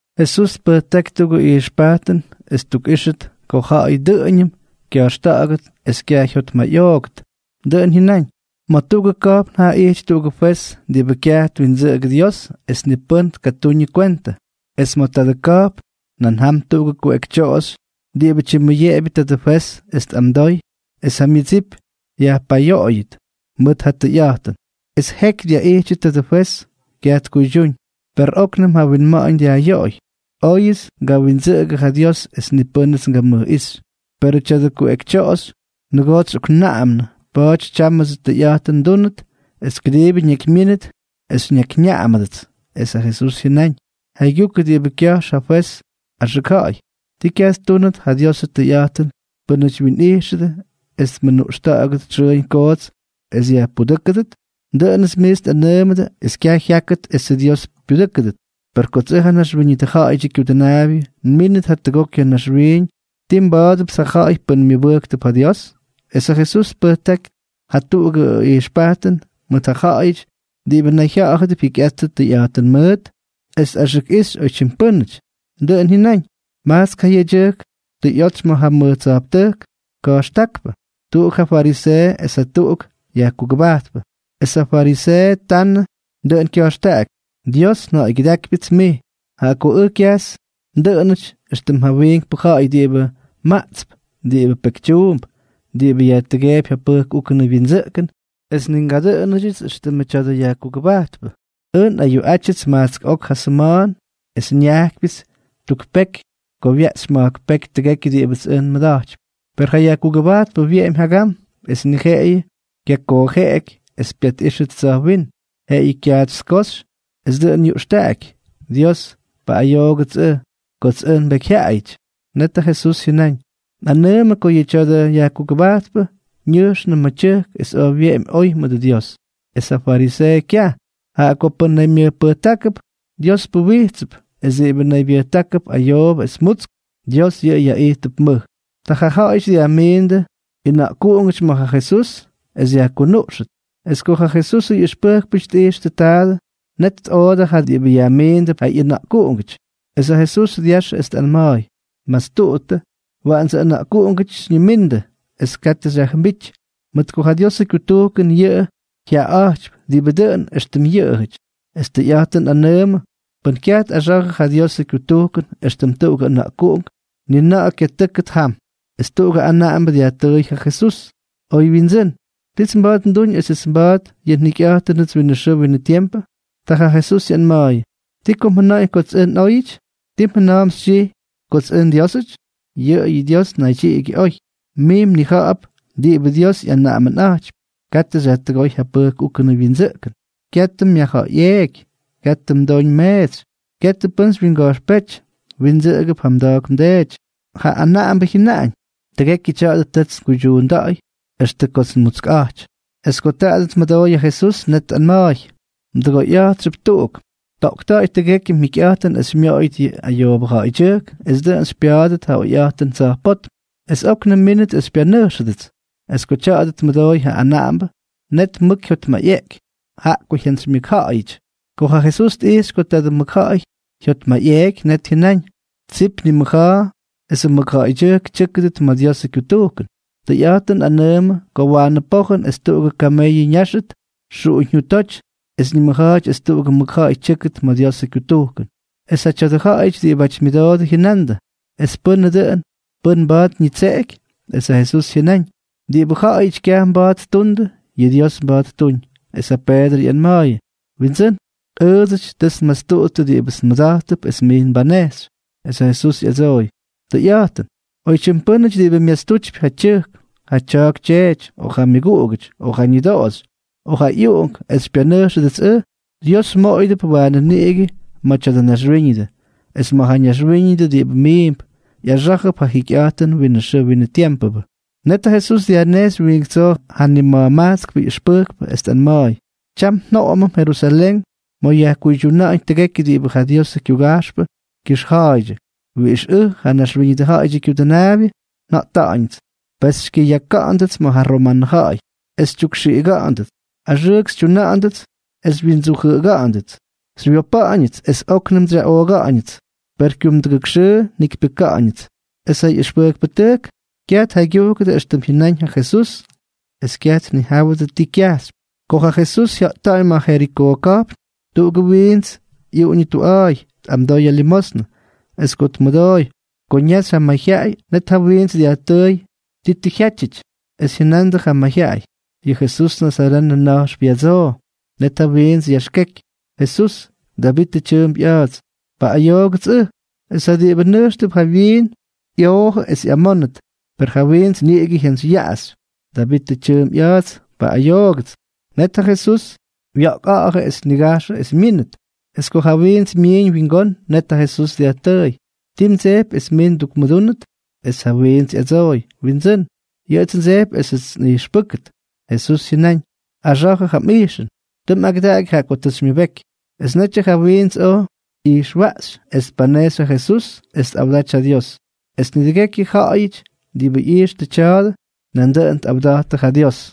Jesús tpʉjtáky tuꞌugʉ ijxpajtʉn es ttukꞌíxʉt ko ja̱ꞌa̱y dʉꞌʉñʉm kya̱jxta̱ꞌa̱ktʉt es kyaj jyotmayꞌooktʉt. Dʉꞌʉn jyʉnáñ: —Ma̱ tuꞌugʉ ka̱jpn jaa ijty tuꞌugʉ fwez diꞌibʉ kyaj twindsʉꞌʉgʉ Dios es ni pʉ́n tkatuñʉ kwentʉ. Es ma̱ tadʉ ka̱jpn nan jam tuꞌugʉ kuꞌekytyoꞌoxy diꞌibʉ tyimmʉyeꞌebyʉ tadʉ fwez es tꞌamdooy es ja myʉdsip yajpayoꞌoyʉt mʉt ja tʉyꞌa̱jtʉn. Es jeky dyaꞌijtyʉ tadʉ fwez, kyaj tkuydyúñ. Per óknʉm ja wyinma̱ꞌa̱ñ dyajꞌyoꞌoy: “Oyʉts ngawindsʉꞌʉgʉ ja Dios es ni pʉ́nʉts ngamʉjꞌíxy, perʉ tya̱dʉ kuꞌekytyoꞌoxy nʉgoots xyꞌoknaꞌamnʉ, pa̱a̱ty tyámʉdsʉ tʉyꞌa̱jtʉn nduunʉt es kʉdiibʉ ñakymyínʉt es xyñakyñaꞌamʉdʉts.” Es ja Jesús jyʉnáñ: —Jaygyukʉ diꞌibʉ kya̱jx ja fwez axʉk ja̱ꞌa̱y. ¿Ti kyaj ttuunʉt ja Diosʉ tʉyꞌa̱jtʉn pʉ́nʉty wyinꞌijxʉdʉ es tmʉnuꞌxta̱ꞌa̱gʉdʉ xʉʉñ koots es yajpudʉ́kʉdʉt? Dʉꞌʉnʉts miits nꞌanʉʉmʉdʉ es kyaj jyákʉt esʉ Dios pyudʉ́kʉdʉ. Per kots ʉj, ja Naxwíñʉdʉ Ja̱ꞌa̱yʉdyʉ Kyudʉnaabyʉ, nmínʉt jatʉgok ya̱ naxwiiñ, ¿tii nba̱a̱dʉpts ja ja̱ꞌa̱y pʉ́n myʉbʉjktʉp ja Dios? Es ja Jesús tpʉjtáky jatuꞌugʉ ijxpajtʉn mʉt ja ja̱ꞌa̱yʉty diꞌibʉ nayjya̱ꞌa̱dʉp jyikyꞌaty tʉyꞌa̱jtʉn mʉʉt es tꞌaxʉkꞌixy oytyim pʉ́nʉty. Dʉꞌʉn jyʉnáñ: —Majtsk ja yedyʉjk tʉ ꞌyotsy ma̱ ja mʉj tsa̱jptʉjk ka̱jxtákpʉ. Tuꞌuk yʉꞌʉ fariseeʉ, es jatuꞌuk yajkugʉbajtpʉ. Es ja fariseeʉ tanʉ, dʉꞌʉn kya̱jxtaꞌaky: “Dios, nja̱ꞌa̱ygyʉdákypyʉts mij, jaꞌa ko ʉj kyajts ndʉꞌʉnʉty éxtʉm ja wiinkpʉ ja̱ꞌa̱y diꞌibʉ maꞌtsp, diꞌibʉ pekytyuump, diꞌibʉ yajtʉgeepy ja pʉjk úkʉnʉ wyindsʉꞌkʉn es ni ngadʉꞌʉnʉdyʉts éxtʉmʉ tya̱dʉ yajkugʉbajtpʉ. Ʉj nꞌayuꞌátyʉts majtsk ok ja sʉma̱a̱n es nyákyʉts tuk peky ko wyaꞌxy ma̱jk peky tʉgekyʉ diꞌibʉts ʉj nbatypy.” ’Per ja yajkugʉbajtpʉ wyeꞌemy jagam, es ni jeꞌeyʉ kyakoojeꞌeky es pyatꞌíxʉt tsa̱jwínm, jeꞌeyʉ kyaatsy tkoxy es dʉꞌʉn ñuꞌxtaꞌaky: “¡Dios, paꞌꞌayoogʉts ʉj, kots ʉj nbekyjyaꞌayʉty!” Net ja Jesús jyʉnáñ: —Nꞌanʉʉmʉ ko yʉ tya̱dʉ yajkugʉbajtpʉ ñʉjxnʉ ma̱ tyʉjk es oj wyeꞌemy oy mʉdʉ Dios, es ja fariseeʉ kyaj. Jaꞌa ko pʉ́n naymyʉjpʉjtákʉp, Dios puwijtsʉp, es diꞌibʉ naybyʉjtákʉp ayoobʉ es mutsk, Dios yʉꞌʉ yaꞌijtʉp mʉj. Ta ja ja̱ꞌa̱yʉty dyajmiindʉ ꞌyʉna̱ꞌkuꞌungʉty ma̱ ja Jesús es yajkunuꞌxʉt. Es ko ja Jesusʉ ꞌyʉxpʉjkpʉty tꞌijxtʉ taadʉ, net tꞌoodʉ ja diꞌibʉ yajmiindʉp ja ꞌyʉna̱ꞌkuꞌunk. Es ja Jesús dyaxʉ es tꞌanma̱a̱y: —Mastuꞌuttʉ, waꞌandsʉ ʉna̱ꞌkuꞌungʉty xyñimíndʉts, es katʉ xyajjʉmbíty, mʉt ko ja Diosʉ kyutujkʉn yʉꞌʉ jyaꞌaꞌa̱jtypy diꞌibʉ dʉꞌʉn éxtʉm yʉꞌʉjʉty. Es tʉyꞌa̱jtʉn nꞌanʉʉmʉ, pʉ́n kyaj tꞌaxa̱jʉ ja Diosʉ kyutujkʉn éxtʉm tuꞌugʉ ʉna̱ꞌkuꞌunk, ni na̱ꞌa̱ kyatʉ́kʉt jam. Es tuꞌugʉ anaꞌambʉ dyajtʉʉy ja Jesús: —Oy windsʉ́n, ¿tits mba̱a̱t nduñ esʉts nba̱a̱dʉt yʉ njikyꞌa̱jtʉnʉts winʉ xʉʉ winʉ tiempʉ? Ta ja Jesús ꞌyanma̱a̱yʉ: —¿Ti ko mjʉna̱ꞌa̱ñ kots ʉj nꞌóyʉty? ¿Ti mjʉna̱a̱mp xytyijy kots ʉj nDiósʉty? Yʉꞌʉyʉ Dios naydyiꞌigyʉ oy. Mij mnija̱ꞌa̱p diꞌibʉ Dios ꞌyanaꞌamʉnꞌa̱jtypy: “Katʉ xyajtʉgóy ja pʉjk úkʉnʉ wyindsʉꞌkʉn; katʉ myajja̱ꞌa̱yꞌeeky; katʉ mdoñ mmeetsy; katʉ pʉ́n xywyinga̱jxpéty; mwindsʉꞌʉgʉp ja mda̱a̱k mdeety.” Ja anaꞌambʉ jyʉnáñ: —Tʉgekyʉ tya̱a̱dʉ tʉts nguydyuunda̱ꞌa̱y extʉ kots nmutskꞌa̱jty. Es ko taadʉ tmʉdooy ja Jesús, net tꞌanma̱a̱y: —Mdʉgoyꞌa̱jtxʉp tuꞌuk. Toꞌkta̱ꞌa̱y tʉgekyʉ mjikyꞌa̱jtʉn es xymyoꞌoyʉt yʉ ayoobʉ ja̱ꞌa̱ydyʉjk es dʉꞌʉn xypya̱a̱dʉt ja oyꞌa̱jtʉn tsa̱jpótm. Es óknʉm mmínʉt es xypyanʉjxʉdʉts. Es ko tya̱a̱dʉ tmʉdooy ja anaꞌambʉ, net mʉk jyotmayꞌeꞌky, jaꞌa ko jyantsymyʉkja̱ꞌa̱yʉty. Ko ja Jesús tꞌijxy ko tadʉ mʉkja̱ꞌa̱y jyotmayꞌeꞌky, net jyʉnáñ: —¡Tsip nimʉja̱a̱ esʉ mʉkja̱ꞌa̱y tyʉ́kʉdʉt ma̱ Diosʉ kyutujkʉn! Tʉyꞌa̱jtʉn nꞌanʉʉmʉ ko waanʉ pojʉn es tuꞌugʉ kameyʉ ñáxʉt xuꞌuñjyutóty es ñimʉja̱a̱ty es tuꞌugʉ mʉkja̱ꞌa̱y tyʉ́kʉt ma̱ Diosʉ kyutujkʉn. Es ja tya̱dʉ ja̱ꞌa̱yʉty diꞌibʉ myʉdoodʉ jyʉnandʉ: —¿Es pʉnʉ dʉꞌʉn, pʉ́n mba̱a̱t ñitseꞌeky? Es ja Jesús jyʉnáñ: —Diꞌibʉ ja̱ꞌa̱yʉty kyaj mba̱a̱t ttundʉ, yʉ Dios mba̱a̱t ttuñ. Es ja Peedrʉ ꞌyanma̱a̱yʉ: —Windsʉ́n, ʉʉdsʉty tʉts nmastuꞌuttʉ diꞌibʉts nmʉda̱jttʉp es mij mbanejxy. Es ja Jesús ꞌyadsooy: —Tʉyꞌa̱jtʉn, oytyim pʉ́nʉty diꞌibʉ myastutypy ja tyʉjk, ja tya̱a̱k tyeety, o ja myʉguꞌugʉty, o ja ñʉdoꞌoxy, o ja ꞌyuꞌunk, es xypyanʉjxʉdʉts ʉj, Dios moꞌoyʉdʉp waanʉ niꞌigʉ ma̱ tya̱dʉ naxwíñʉdʉ, es ma̱ ja naxwíñʉdʉ diꞌibʉ miimp, ꞌyaxá̱jʉp ja jikyꞌa̱jtʉn winʉ xʉʉ winʉ tiempʉ. Net ja Jesús dyajnejxy wiink tsoo ja nima̱jmajtskpʉ ꞌyʉxpʉjkpʉ, es tꞌanma̱a̱y: —Tyam njoꞌomʉm Jerusalén ma̱ yajkuydyuna̱ꞌa̱ñ tʉgekyʉ diꞌibʉ ja Diosʉ kyuga̱jxpʉ kyʉxja̱a̱ydyʉ, wiꞌix ʉj, ja Naxwíñʉdʉ Ja̱ꞌa̱yʉdyʉ Kyudʉnaabyʉ, njata̱ꞌa̱ñʉts. Pes xykyʉyaka̱ꞌa̱ndʉts ma̱ ja romanʉ ja̱ꞌa̱y, es xytyukxiꞌiga̱ꞌa̱ndʉts, axʉʉk xytyuna̱ꞌa̱ndʉts es xywyindsujʉꞌʉga̱ꞌa̱ndʉts. Xywyopa̱ꞌa̱ñʉts es óknʉm xyaꞌooga̱ꞌa̱ñʉts; per kyumdʉgʉk xʉʉ njikypyʉka̱ꞌa̱ñʉts. Es ja ꞌyʉxpʉjkpʉtʉjk kyaj tjaygyujkʉdʉ éxtʉm jyʉnáñ ja Jesús es kyaj tnijáwʉdʉ ti kyajxypy. Ko ja Jesús jya̱ꞌtáñ ma̱ ja Jerikoo ka̱jpn, tuꞌugʉ wiints ꞌyuꞌuñʉ tuꞌa̱a̱y tꞌamdoy ja limosnʉ. Es ko tmʉdooy ko ñaxy ja mayjyaꞌay, net ja wiints dyajtʉʉy ti tʉ jyátyʉty. Es jyʉnandʉ ja mayjyaꞌay: —Yʉ Jesús nazarenʉ na̱jxp ya̱dsoo. Net ja wiints yaxkeky: —Jesús, Davitʉ tyʉʉmp ꞌya̱a̱ts, ¡paꞌꞌayoogʉts ʉj! Es ja diꞌibʉ nʉjxtʉp jawyiin ꞌyoojʉ es ꞌyamónʉt. Per ja wiints niꞌigʉ jyantsyyaꞌaxy: —Davitʉ tyʉʉmp ꞌya̱a̱ts, ¡paꞌꞌayoogʉts! Net ja Jesús wya̱ꞌkꞌa̱ꞌa̱jʉ es tnigajxʉ es myínʉt. Es ko ja wiints myiñ wingón, net ja Jesús dyajtʉʉy: —¿Ti mdsejpy es mij ndukmʉdúnʉt? Es ja wiints ꞌyadsooy: —Windsʉ́n, yʉꞌʉts ndsejpy esʉts nꞌijxpʉ́kʉt. Jesús jyʉnáñ: —Axa̱jʉ ja mꞌijxʉn, tʉ mꞌagʉdaky jaꞌa ko tʉ xymyʉbeky. Es netyʉ ja wiints oj ꞌyijxwaꞌxy, es tpanejxy ja Jesús es tꞌawdaty ja Dios. Es nidʉgekyʉ ja̱ꞌa̱yʉty diꞌibʉ ꞌyijxtʉ tya̱a̱dʉ, nandʉꞌʉn tꞌawda̱jty ja Dios.